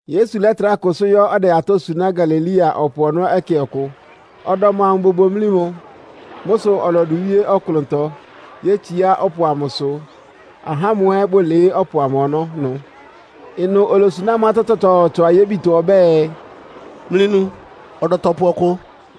Yesu lɛ́trá kʋsʋ́ yɔ́ ɔdɛ atɔ́ suná Galilea ɔpʋ ɔnɔ́ ɛkɛ ɔkʋ. Ɔdɔm amʋ bobomlí mʋ. Mʋ́ sʋ ɔlɔdʋ wíé ɔklʋntɔ, yétsiá ɔpʋ amʋsʋ, ahá ámʋ ɛ́ bʋlɩɩ́ ɔpʋ ɔnɔ́ ɩnʋ. Ɩnʋ olosuná amʋ́ atɔ́ tsɔtsɔɔtsɔ ayébitɔ ɔbɛ́ɛ, “Mlɩnu! Ɔdɔtɔpʋ ɔkʋ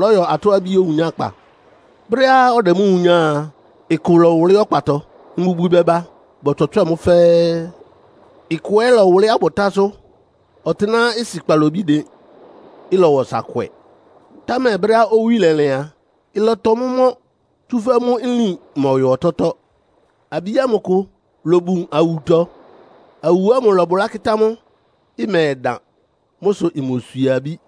lɔ́yɔ atɔ́-abí owunyákpa. Brɛ́á ɔdɛ mʋ́ wunyáa a, ɩkʋ lɔwʋlɩ́ ɔkpatɔ, mbubwi bɛba bɔtswɛtswɛ́ɛ mʋ́ fɛ́ɛ́. Ɩkʋ ɛ́ lɔwʋlɩ́ abʋtásʋ́, ɔtɩ́nɛ́á ɩsɩ kpalobí dɩn. Ɩlɔwa ɔsa kwɛ, támɛ brɛ́á owí lɛlɩn a, ɩlɔtɔ mʋ́ mɔ́, tsúfɛ́ mʋ́ nlín mɔyɔ ɔtɔ́tɔ́. Abí ámʋ kʋ lobun awutɔ, awu ámʋ lɔbʋlá kɩ́tá mʋ́, ɩmɛdan. Mʋ́ sʋ imoswie abí.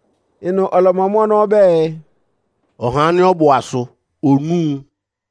Ɩnʋ ɔlɔmɔ mʋ́ ɔnɔ́ ɔbɛ́ɛ, “Ɔhá ánɩ́ ɔbʋ asʋ onúu!”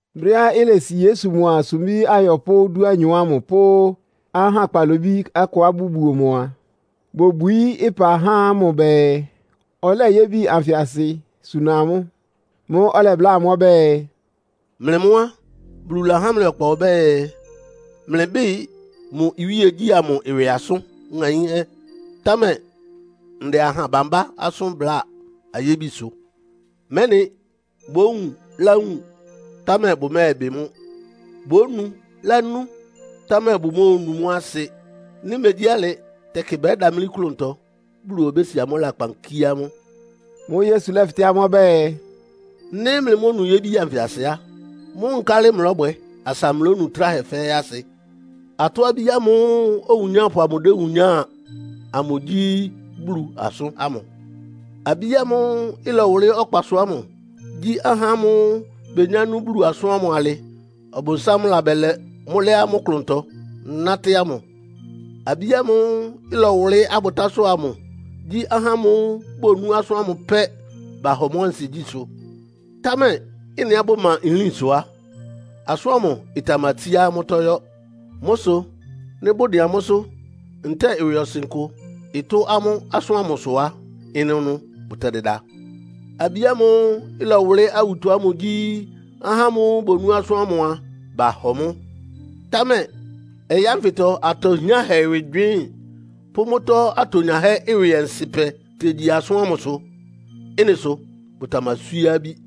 Brɛ́á ilesi Yesu mʋa sumbí ayɔpʋ́ dúanyɔ ámʋ pʋ́ ahá kpalobí akʋá bʋbuo mʋ a, bobwií ɩpa há mʋ bɛɛ, ɔlɛ́ yébi anfɩ asɩ suna amʋ́. Mʋ́ʋ́ ɔlɛbláa amʋ́ ɔbɛ́ɛ, “Mlɩ mʋ́ á, Bulu lahá mlɩ ɔkpa ɔbɛ́ɛ, mlɩbɩ́ɩ mʋ iwíegyí ámʋ ɩwɩ asʋn ŋaínhɛ́. Támɛ ndɛ aha bambá asʋ́n bláa ayébisʋ, ‘mɛ́nɩ bówun láwun, támɛ bʋmɛ́ɛbɩ mʋ́. Bónu lánú, támɛ bʋmóonu mʋ́ asɩ. Nɩ́ megyí alɩ tɛkɩ bɛ́damlí klʋntɔ, Bulu obési amʋ́ lakpan kíé amʋ́.’” Mʋ́ʋ́ Yesu lɛ́fɩtɛ́ amʋ́ ɔbɛ́ɛ, “Nɩ́ mlɩmónu yébi anfɩ asɩ á, mʋ́ nkálɩ mlɔ́bwɛ asa mlónu tráhɛ fɛ́ɛ́ asɩ? Atɔ́-abí ámʋ́ʋ́ owunyápʋ amʋ déwunyáa amʋ gyí Bulu asʋ́n ámʋ. Abí ámʋ́ʋ́ ɩlɔwʋlɩ́ ɔkpasʋ ámʋ gyí ahá ámʋ́ʋ́ benyá nú Bulu asʋ́n ámʋ alɩ Ɔbʋnsám labɛlɛ mʋ́ lɛ́ amʋ́ klʋntɔ nátɩ́ ámʋ. Abí ámʋ́ʋ́ ɩlɔwʋlɩ́ abʋtásʋ́ amʋ gyí ahá amʋ́ʋ́ bonú asʋ́n ámʋ pɛ́, bahɔ mʋ́ ansigyísʋ́, támɛ ɩ́nɩá bʋma nlín sʋ á, asʋ́n ámʋ ɩtamatsíá amʋ́tɔ́ yɔ́. Mʋ́ sʋ nɩ́ bʋdɩn amʋ́sʋ́ ntɛ́ɛ ɩwɩɔsɩn kʋ ɩtʋ́ amʋ́ asʋ́n ámʋ sʋ á, ɩnʋnʋ bʋtɛdɩda. Abí ámʋ́ʋ́ ɩlɔwʋlɩ́ awutɔ ámʋ gyí ahá amʋ́ʋ́ bonú asʋ́n ámʋ a, bahɔ mʋ́, támɛ ɔyɩ́ ánfɩtɔ atɔ hiánhɛ ɩwɩ gywɩɩ́n, pʋ́ mʋ́tɔ́ atonyahɛ́ ɩwɩ ɔnsɩ́pɛ tegyi asʋ́n ámʋsʋ. Ɩ́nɩ sʋ bʋtamaswíé abí.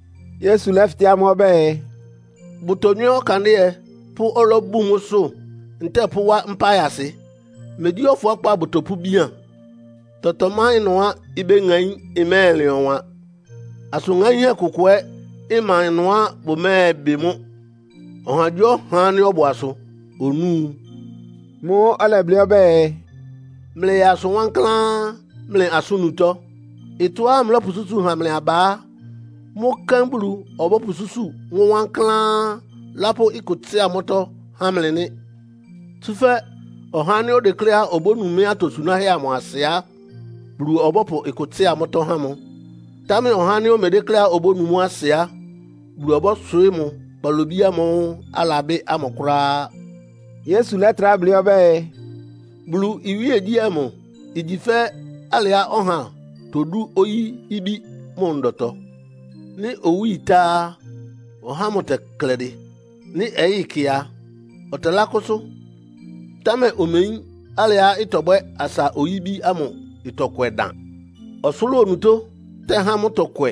Yesu lɛ́fɩtɛ́ amʋ́ ɔbɛ́ɛ, “Bʋtonywɛ́ ɔkandɩ́ɛ pʋ́ ɔlɔ́ bun mʋ́sʋ́, ntɛ́ɛ pʋ́wá mpá ayasɩ? Megyí ɔfʋákpá bʋtɔpʋ́bian? Tɔtɔ ma ɩnʋá ibéŋaín, ɩmɛ́ɛlɩn ɔwan. Asʋn ŋaínhɛ́ kʋkʋ ɛ́ ɩma ɩnʋá bʋmɛ́ɛbɩ mʋ́. Ɔhagyíɔha ánɩ́ ɔbʋ asʋ onúu!” Mʋ́ʋ́ ɔlɛblɩ́ ɔbɛ́ɛ, “Mlɩyaa asʋ wankláán mlɩ asʋ́n-nutɔ́. Ɩtɔ́á mlɔ́pʋsúsu ha mlɩ aba á, mʋ́ kɛ́n Bulu ɔbɔ́pʋsúsu mʋ́ wankláán, lápʋ́ ɩkʋ tsɩ́a mʋ́tɔ́ há mlɩ nɩ́. Tsúfɛ́ ɔhá ánɩ́ odekléá obónu mɩ́ atosunáhɛ́ amʋ asɩ á, Bulu ɔbɔ́pʋ ɩkʋ tsɩ́a mʋ́tɔ́ há mʋ. Támɛ ɔhá ánɩ́ omedékléá obónu mʋ́ asɩ á, Bulu ɔbɔ́swɩɩ́ mʋ kpalobí ámʋ́ʋ́ alabɩ́ ámʋ kʋ́ráá.” Yesu lɛ́trá blɩ́ ɔbɛ́ɛ, “Bulu iwíegyí amʋ igyi fɛ́ alɩá ɔha todú oyí-ibí mʋ ndɔtɔ. Nɩ́ owí ɩtá á, ɔhá ámʋ tɛklɛdɩ. Nɩ́ ɔyɩ́ ɩkɛ a, ɔtɛlákʋ́sʋ́, támɛ omeyín alɩá ɩtɔbwɛ́ asa oyí-ibí ámʋ ɩtɔkwɛ dan. Ɔsʋlʋ́ʋ onutó tɛhá mʋ́ tɔkwɛ.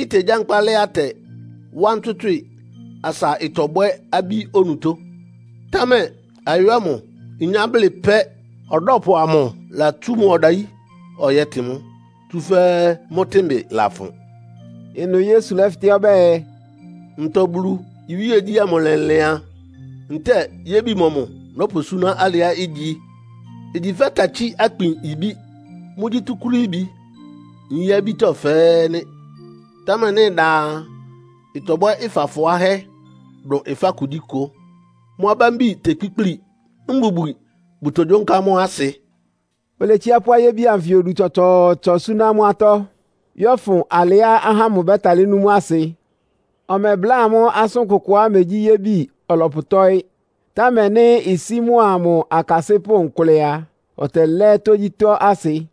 Itegyankpá lɛ́ atɛ, wá ntswɩ́tswɩ́ɩ, asa ɩtɔbɔbwɛ abí onutó. Támɛ ayó ámʋ inyá blɩ pɛ́, ɔdɔ́pʋ amʋ latsú mʋ ɔdayí ɔyɛ́tɩn mʋ́, tsúfɛ́ mʋ́ tɩ́nbɩ lafʋn.” Ɩnʋ Yesu lɛ́fɩtɛ́ ɔbɛ́ɛ, “Ntɔ Bulu iwíegyí ámʋ lɛlɩan? Ntɛ́ɛ yébi mɔmʋ nɔ́pʋsúná alɩá igyi? Igyi fɛ́ takyí-akpin ibí. Mʋ́gyí túkúrííbi nyí-abítɔ́ fɛ́ɛ́ nɩ́. Támɛ nɩ́ ɩdan a, ɩtɔbwɛ́ ɩfá fʋ́áhɛ́ dʋn ɩfá kugyíkʋ. Mʋ́ abámbi tekpíkpli, mbubwi bʋtogyónká mʋ́ asɩ.” Oletsiá pʋ́ ayébi anfɩ odu tsɔtsɔɔtsɔ súná amʋ́ atɔ́, yɔ́fʋn alɩá ahá ámʋ bɛ́talɩ́ nú mʋ́ asɩ. Ɔmɛbláa amʋ́ asʋ́n kʋkʋá imegyí ayébi ɔlɔpʋtɔ́ɩ́. Támɛ nɩ́ isí mʋa mʋ akasɩ́pʋ́ nkʋlɛ a, ɔtɛlɛ́ tógyítɔ́ asɩ.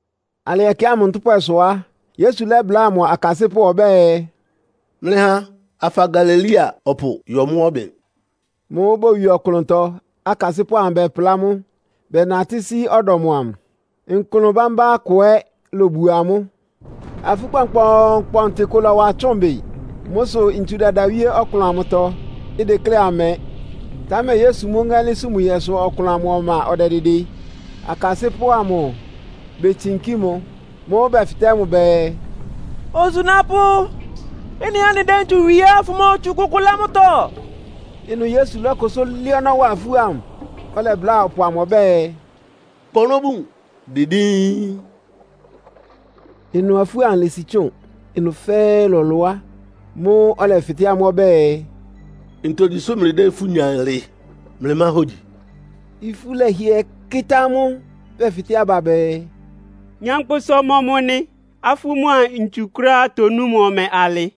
Alɩ ɛkɛ ámʋ ntʋ́pwɛsʋ á, Yesu lɛ́bláa mʋ akasɩ́pʋ́ ɔbɛ́ɛ, “Mlɩha afa Galilea ɔpʋ yɔ mʋ́ ɔbɩn!” Mʋ́ʋ́ bowie ɔklʋntɔ, akasɩ́pʋ́ amʋ bɛplá mʋ́, bɛnatɩ́ sí ɔdɔm amʋ. Nklʋn bámbá kʋ ɛ́ lobuo amʋ́. Afú kpɔnkpɔɔnkpɔntɩ kʋ lɔ́wa tsʋ́ʋn bɩ. Mʋ́ sʋ ntsu dɛda wíé ɔklʋn amʋtɔ, ideklé ɩmɛ. Támɛ Yesu mʋ́ ŋɛ́lɩ́n sumuɛsʋ ɔklʋn amʋ ɔma ɔdɛdɩdɩ. Akasɩ́pʋ́ amʋ betsinkí mʋ. Mʋ́ʋ́ bɛfɩtɛ́ mʋ bɛɛ, “Osunápʋ́, ɩ́nɩá anɩdɛ́ ntsu wie á, fʋmotsu kʋkʋ lɛ́ mʋ́tɔ́?” Ɩnʋ Yesu lɔ́kʋsʋ́ lɛ́ ɔnɔ́ wa afú ámʋ, ɔlɛbláa ɔpʋ amʋ ɔbɛ́ɛ, “Kpa ɔnɔ́ bun! Dɩ díín!” Ɩnʋ afú ámʋ lési tsʋ́ʋn, ɩnʋ fɛ́ɛ́ lɔlʋá. Mʋ́ʋ́ ɔlɛfɩtɛ́ amʋ́ ɔbɛ́ɛ, “Ntogyi sʋ́ mlɩdɛ́ ifú nya alɩ? Mlɩmá hógyi?” Ifú lɛhɩɛ kɩ́tá amʋ́, bɛfɩtɛ́ aba bɛɛ, “Nyankpʋsa ɔmɔmʋ nɩ, afú mʋ́a ntsu kʋ́ráá tonú mʋ ɔmɛ alɩ?”